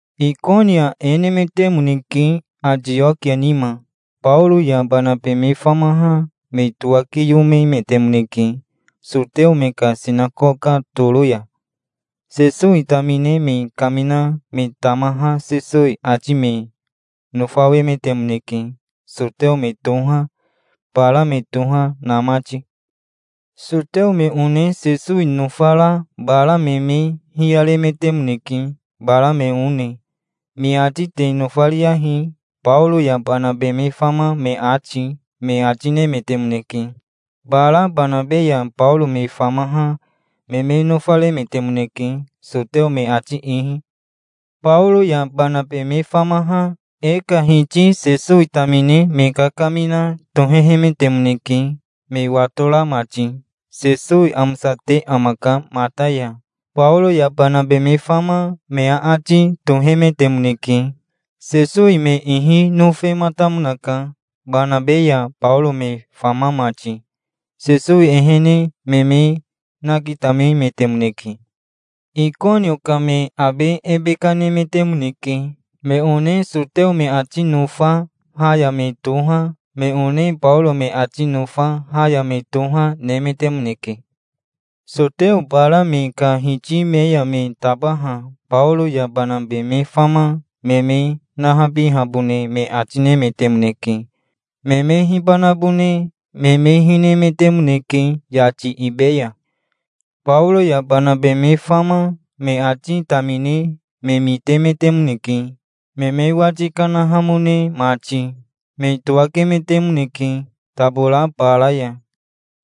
Ikonio e nemetemoneke, Atiokia nima. Baoro ya Banabe me famaha me towakiyomemetemoneke soteo me ka sinakoka toro ya. Sesowi tamine me kamina me tamaha Sesowi ati me nofawemetemoneke, soteo me toha, bara me toha, na mati. Soteo me one Sesowi nofara bara me me hiyaremetemoneke, bara me one. "Me ati te nofariyahi, Baoro ya Banabe me fama me ati", me ati nemetemoneke. Bara Banabe ya Baoro me famaha me me nofaremetemoneke, soteo me ati ihi. Baoro ya Banabe me famaha e ka Hiti Sesowi tamine me kakamina tohehemetemoneke me watora mati. "Sesowi amosate amaka mata ya", Baoro ya Banabe me fama me aati tohemetemoneke. Sesowi me ihi nofematamonaka, Banabe ya Baoro me fama mati. Sesowi ehene me me nakitamemetemoneke. Ikonio ka me abe ebe kanemetemoneke. Me one soteo me ati nofa ha ya me toha, me one Baoro me ati nofa ha ya me toha, nemetemoneke. Soteo bara me ka hiti me ya me tabaha Baoro ya Banabe me fama me me nahabihabone me ati nemetemoneke. Me me hibanabone me me hinemetemoneke yati ibe ya. Baoro ya Banabe me fama me ati tamine me mitemetemoneke, me me wati kanahamone mati. Me towakemetemoneke tabora bara ya.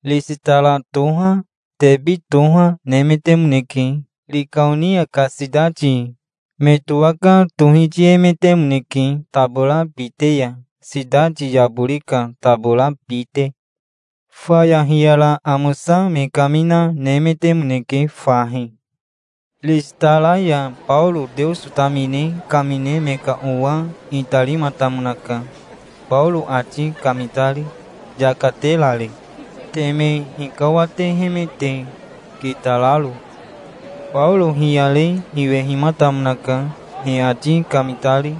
Ristara toha, Tebi toha, nemetemoneke, Rikaonia ka sitati. Me towaka tohitiemetemoneke tabora bite ya, sitati yabori ka tabora bite. Faya hiyara amosa me kamina, nemetemoneke fahi. Ristara ya Baoro Teoso tamine kamine me ka owa itarimatamonaka, Baoro ati kamitari, yaka terari, teme hikawatehemete kitararo. Baoro hiyare hiwehimatamonaka, he ati kamitari.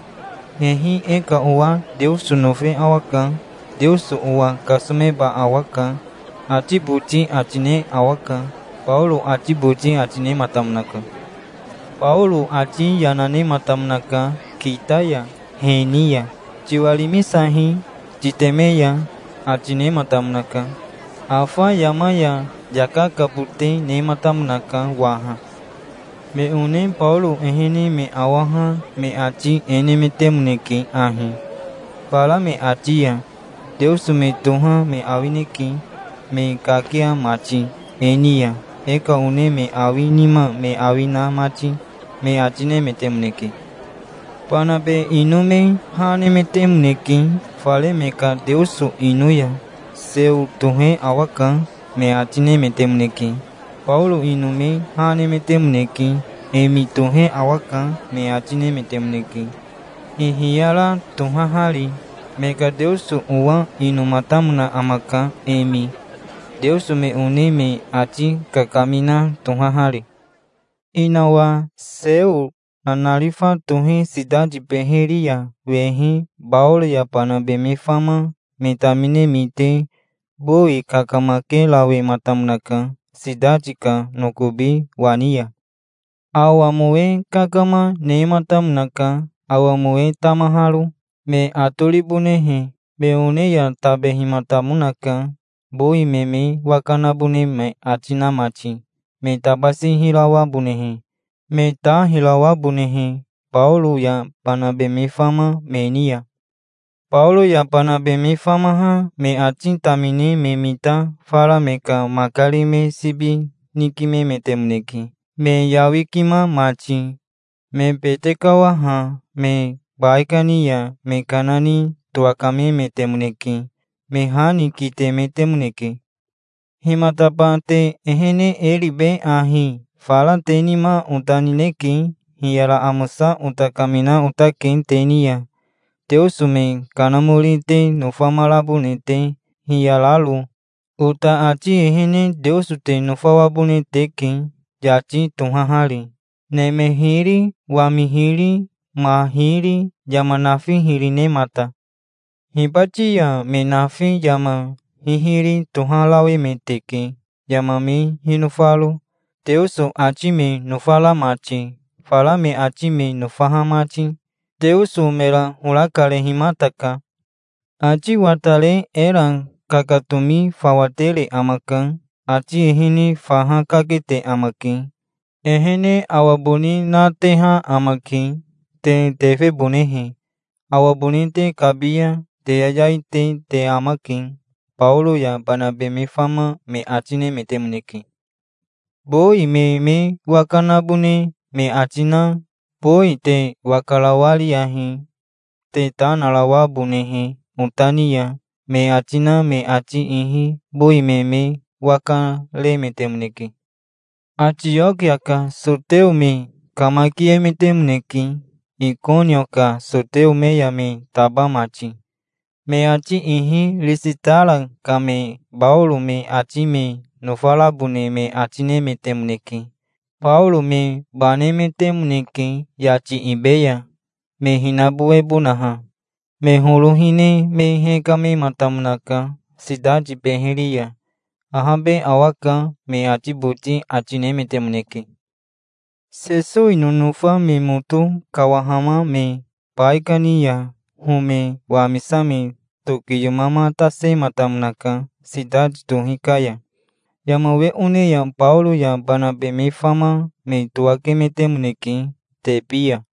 "'Hehi e ka owa Teoso nofe awaka. Teoso owa kasomeba awaka', ati boti ati ne awaka", Baoro ati boti ati nematamonaka. Baoro ati yana nematamonaka kita ya he ni ya. "Tiwarimisahi titeme ya", ati nematamonaka. Afa yama ya yaka kabote nematamonaka waha. Me one Baoro ehene me awaha me ati e nemetemoneke ahi, fara me ati ya: "Teoso me toha me awineke, me kakia mati e ni ya, e ka one me awi nima me awi na mati", me ati nemetemoneke. Banabe ino me ha nemetemoneke, fare me ka teoso ino ya. "Seo tohe awaka", me ati nemetemoneke. Baoro ino me ha nemetemoneke. "Emi tohe awaka", me ati nemetemoneke, hihiyara tohahari. Me ka teoso owa inomatamona amaka, Emi, teoso me one me ati kakamina tohahari. Inawa Seo nanarifa tohe sitati beheri ya wehi Baoro ya Banabe me fama me tamine mite bowi kakamakerawematamonaka sitati ka nokobi wani ya. Awa mowe kakama, nematamonaka, awa mowe tamaharo, me atoribonehe. Me one ya tabehimatamonaka, bowi me me waka nabone me ati na mati, me tabasi hirawabonehe, me ta hirawabonehe Baoro ya Banabe me fama me ni ya. Baoro ya Banabe me famaha me ati tamine me mita fara me ka makari me sibi nikimemetemoneke me yawikima mati. Me bete kawaha me baikani ya me kana ni towakamemetemoneke. Me ha ni kitemetemoneke. "Himataba te ehene e ribe ahi? Fara te nima ota nineke. Hiyara amosa ota kamina otake te ni ya, teoso me kanamori te nofamarabone te, hiyararo. Ota ati ehene Teoso te nofawabone teke, yati tohahari, neme hiri, wami hiri, ma hiri, yama nafi hiri, nemata. Hibati ya me nafi yama hihiri toharawemeteke, yama me hinofaro, Teoso ati me nofara mati, fara me ati me nofaha mati. Teoso mera hora karehimataka. Ati watare era kakatomi fawa tere amaka. Ati ehene faha kakete amake. Ehene awa boni nateha amake, te tefebonehe. Awa boni te kabi ya te yayai te te amake", Baoro ya Banabe me fama me ati nemetemoneke. Bowi me me waka nabone me ati na "Bowi te waka rawa riyahi, te ta narawabonehe ota ni ya", me ati na me ati ihi bowi me me waka remetemoneke. Atiokia ka soteo me kamakiemetemoneke, Ikonio ka soteo me ya me taba mati. Me ati ihi Ristara ka me Baoro me ati me nofarabone me ati nemetemoneke. Baoro me banemetemoneke yati ibe ya, me hinabowebonaha. Me horo hine me hekamematamonaka sitati beheri ya. "Ahabe awaka", me ati boti ati nemetemoneke. Sesowi nonofa me moto kawahama me baikani ya home wamisame tokiyomamatasematamonaka sitati tohi ka ya. Yama we one ya Baoro ya Banabe me fama me towakemetemoneke Tebi ya.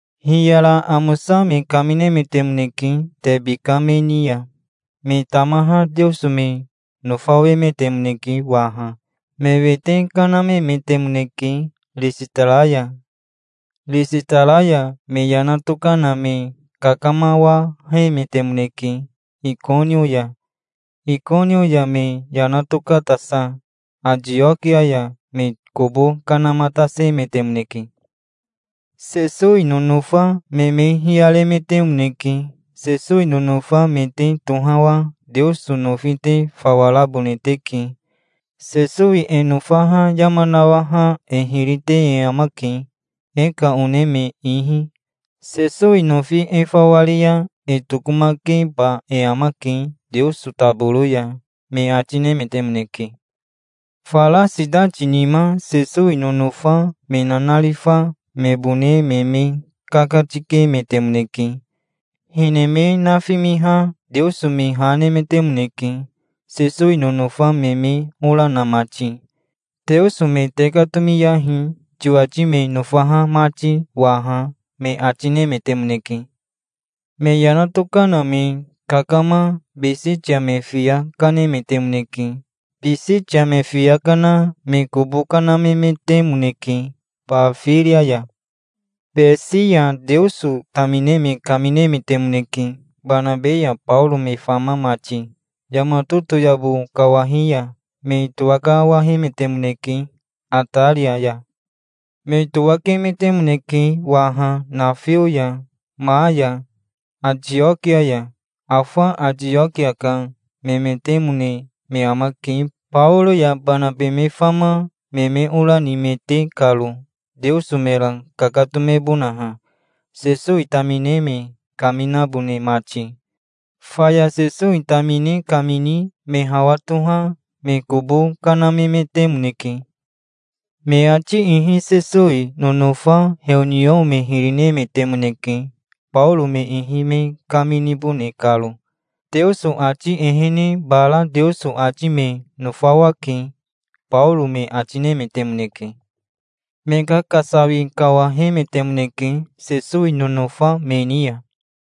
Hiyara amosa me kaminemetemoneke Tebi ka me ni ya. Me tamaha Teoso me nofawemetemoneke waha. Me wete kanamemetemoneke Ristara ya. Ristara ya me yana tokana me kakamawahemetemoneke Ikonio ya. Ikonio ya me yana tokatasa Atiokia ya me kobo kanamatasemetemoneke. Sesowi nonofa me me hiyaremetemoneke. "Sesowi nonofa me te tohawa Teoso nofi te fawa rabone teke. Sesowi e nofaha yama nawaha e hiri te e amake, e ka one me ihi. Sesowi nofi e fawa ri ya e tokomakeba e amake Teoso taboro ya", me ati nemetemoneke. Fara sitati nima Sesowi nonofa me nanarifa mebone me me kakatikemetemoneke. Hine me nafimiha Teoso me ha nemetemoneke, Sesowi nonofa me me ora na mati. "Teoso me tekatomiyahi, tiwati me nofaha mati waha", me ati nemetemoneke. Me yana tokana me kakama Bisitia me fiya kanemetemoneke. Bisitia me fiya kana me kobo kanamemetemoneke Bafiria ya. Besi ya Teoso tamine me kaminemetemoneke, Banabe ya Baoro me fama mati. Yama totoyabo kawahi ya me towakawahemetemoneke Ataria ya. Me towakemetemoneke waha nafio ya ma ya Atiokia ya. Afa Atiokia ka memetemone me amake, Baoro ya Banabe me fama me me ora nimete karo, Teoso mera kakatomebonaha, Sesowi tamine me kaminabone mati. Faya Sesowi tamine kamini me hawa toha me kobo kanamemetemoneke. Me ati ihi Sesowi nonofa heoniao me hiri nemetemoneke, Baoro me ihi me kaminibone karo. "Teoso ati ehene bara Teoso ati me nofawake", Baoro me ati nemetemoneke. Me kakasawi kawahemetemoneke Sesowi nonofa me ni ya.